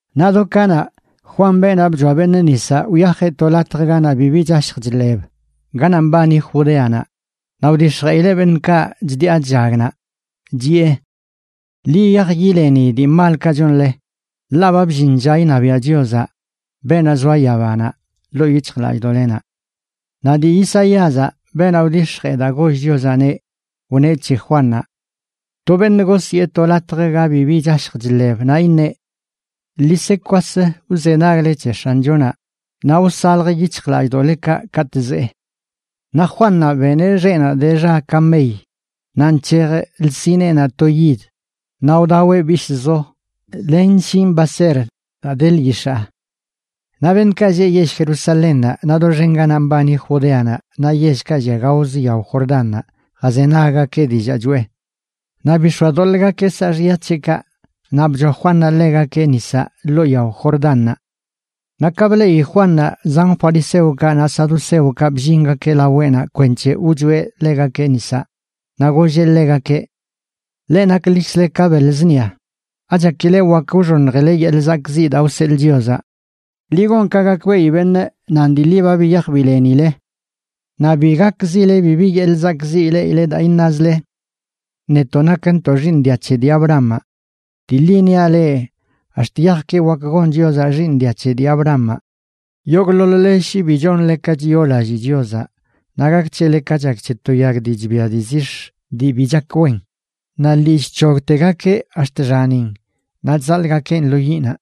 Naꞌ do kanaꞌ, Juan, beenaꞌ bchoa beṉꞌ nisaꞌ, wyajeꞌ to latj ganaꞌ bibi chashj chḻeb ganaꞌ mbani Judeanaꞌ, naꞌ wdix̱jeꞌileꞌ beṉꞌkaꞌ chdiꞌa chllag naꞌ, chiꞌe: ―Ḻi yiyaj yileni dii malkaꞌ chonle, ḻaꞌ ba bllin lla iṉabiaꞌ Chiozaꞌ, beenaꞌ zoa yabanaꞌ, ḻoo yic̱hjlallꞌdoꞌlenaꞌ. Naꞌ dii Isaíazaꞌ, beenaꞌ wdix̱jee daa goll Chiozaꞌneꞌ, wneꞌ c̱he Juannaꞌ: To beṉꞌ gosyee to lo latj ga bibi chashj chḻeb, naꞌ iṉeꞌ: “Ḻi se kwas wzenagle c̱he X̱anchonaꞌ naꞌ wsalj yic̱hjlallꞌdoꞌlekaꞌ katꞌ zee.” Naꞌ Juannaꞌ beneꞌ xeꞌnaꞌ de xa kamey, naꞌ nc̱hej lsineenaꞌ to yid. Naꞌ wdaweꞌ bishꞌzo len shin baser daa de lyix̱aa. Naꞌ beṉꞌkaꞌ lleꞌ yell Jerusalénnaꞌ, naꞌ doxen ganaꞌ mbani Judeanaꞌ naꞌ yellkaꞌ llia gaoz yao Jordánnaꞌ jazenaggakeꞌ dillaa choꞌe. Naꞌ bix̱oadoḻꞌgakeꞌ saaxya c̱heꞌkaꞌ, naꞌ bchoa Juannaꞌ ḻegakeꞌ nisaꞌ ḻoo yao Jordánnaꞌ. Naꞌ ka bleꞌi Juannaꞌ zan fariseokaꞌ naꞌ saduceokaꞌ bllingakeꞌ laweꞌnaꞌ kwenc̱he wchoeꞌ ḻegakeꞌ nisaꞌ, naꞌ golleꞌ ḻegakeꞌ: ―¡Leꞌ naklikzle ka beḻ zṉia! ¿Achakile wak wxoṉjileꞌ yeḻꞌ zakꞌziꞌ daa wseḻꞌ Chiozaꞌ? Ḻi gon ka gakbeꞌi beṉꞌ nan dii ḻi ba biyaj bilenile. Naꞌ bi gakzile bibi yeḻꞌ zakꞌziꞌ ileꞌile daa iṉazle: “Netoꞌ nakntoꞌ xiiṉ dia c̱he dii Abrahamaꞌ.” Dii ḻi niaꞌ leꞌ, ax̱t yajki wak gon Chiozaꞌ xiiṉ dia c̱he dii Abrahamaꞌ. Yogꞌḻoḻ-le shi bi chonle ka chiyoolallii Chiozaꞌ naꞌ gak c̱hele ka chak c̱he to yag dii chbia dii zix̱ dii bi chak wen, naꞌ lii chc̱hogtegakeꞌ ax̱t xanin naꞌ chzaḻꞌgakeꞌn lo yiꞌnaꞌ.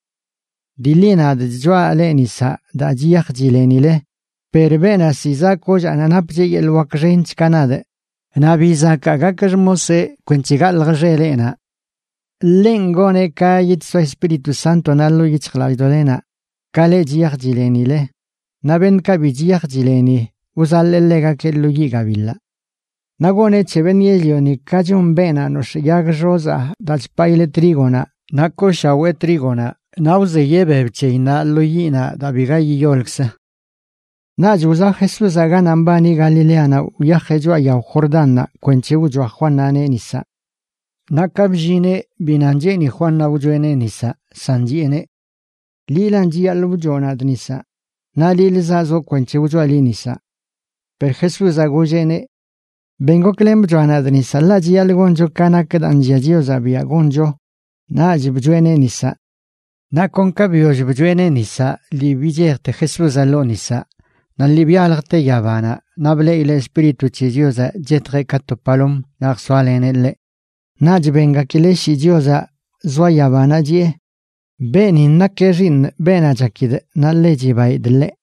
Dii ḻi nadꞌ chchoaꞌ leꞌ nisaꞌ daa chiyaj chilenile, per beenaꞌ ziꞌ zaꞌ kollaanaꞌ napcheꞌ yeḻꞌ wak xench ka nadꞌ, naꞌ ni bi zakaa gakꞌ xmoseꞌ kwenc̱he galjꞌ xeleꞌnaꞌ. Ḻenꞌ goneꞌ ka yidsoa Espíritu Sántonaꞌ ḻoo yic̱hjlallꞌdoꞌlenaꞌ, ka leꞌ chiyaj chilenileꞌ, naꞌ beṉꞌkaꞌ bi chiyaj chileni wzaḻee ḻegakeꞌ lo yiꞌ gabiḻaꞌ. Naꞌ goneꞌ c̱he beṉꞌ yell-lioni ka chon beenaꞌ nox̱ꞌ yag xozaa daa chpaꞌileꞌ trígonaꞌ naꞌ kooshawee trígonaꞌ naꞌ wzeyeꞌ beb c̱heyinnaꞌ lo yiꞌnaꞌ daa biga yiyolkzə. Naꞌch wzaꞌ Jesúzaꞌ ganaꞌ mbani Galileanaꞌ wyajeꞌ choꞌa yao Jordánnaꞌ kwenc̱he wchoa Juannaꞌneꞌ nisaꞌ. Naꞌ ka bllineꞌ, bi nan cheeni Juannaꞌ wchoeꞌneꞌ nisaꞌ, san chiꞌeneꞌ: ―Liꞌlan chiyaḻꞌ wchoꞌ nadꞌ nisaꞌ, naꞌ liꞌlə zaꞌzoꞌ kwenc̱he wchoaꞌ liꞌ nisaꞌ. Per Jesúzaꞌ golleꞌneꞌ: ―Ben goklen bchoaꞌ nadꞌ nisaꞌ ḻaꞌ chiyaḻꞌ goncho ka nak daa nllia Chiozaꞌ biaꞌ goncho. Naꞌch bchoeꞌneꞌ nisaꞌ. Naꞌ kon ka biyoll bchoeꞌneꞌ nisaꞌ lii bichejte Jesúzaꞌ ḻoo nisaꞌ naꞌ lii byaljte yabanaꞌ naꞌ bleꞌileꞌ Espíritu c̱he Chiozaꞌ chetjeꞌ ka to palom naꞌ jsoaleneꞌ ḻeꞌ. Naꞌch bengakileꞌ shii Chiozaꞌ zoa yabanaꞌ chiꞌe: ―Beenin nakeꞌ Xiiṉꞌ, beenaꞌ chakidꞌ, naꞌ ḻe chibaidꞌ ḻeꞌ.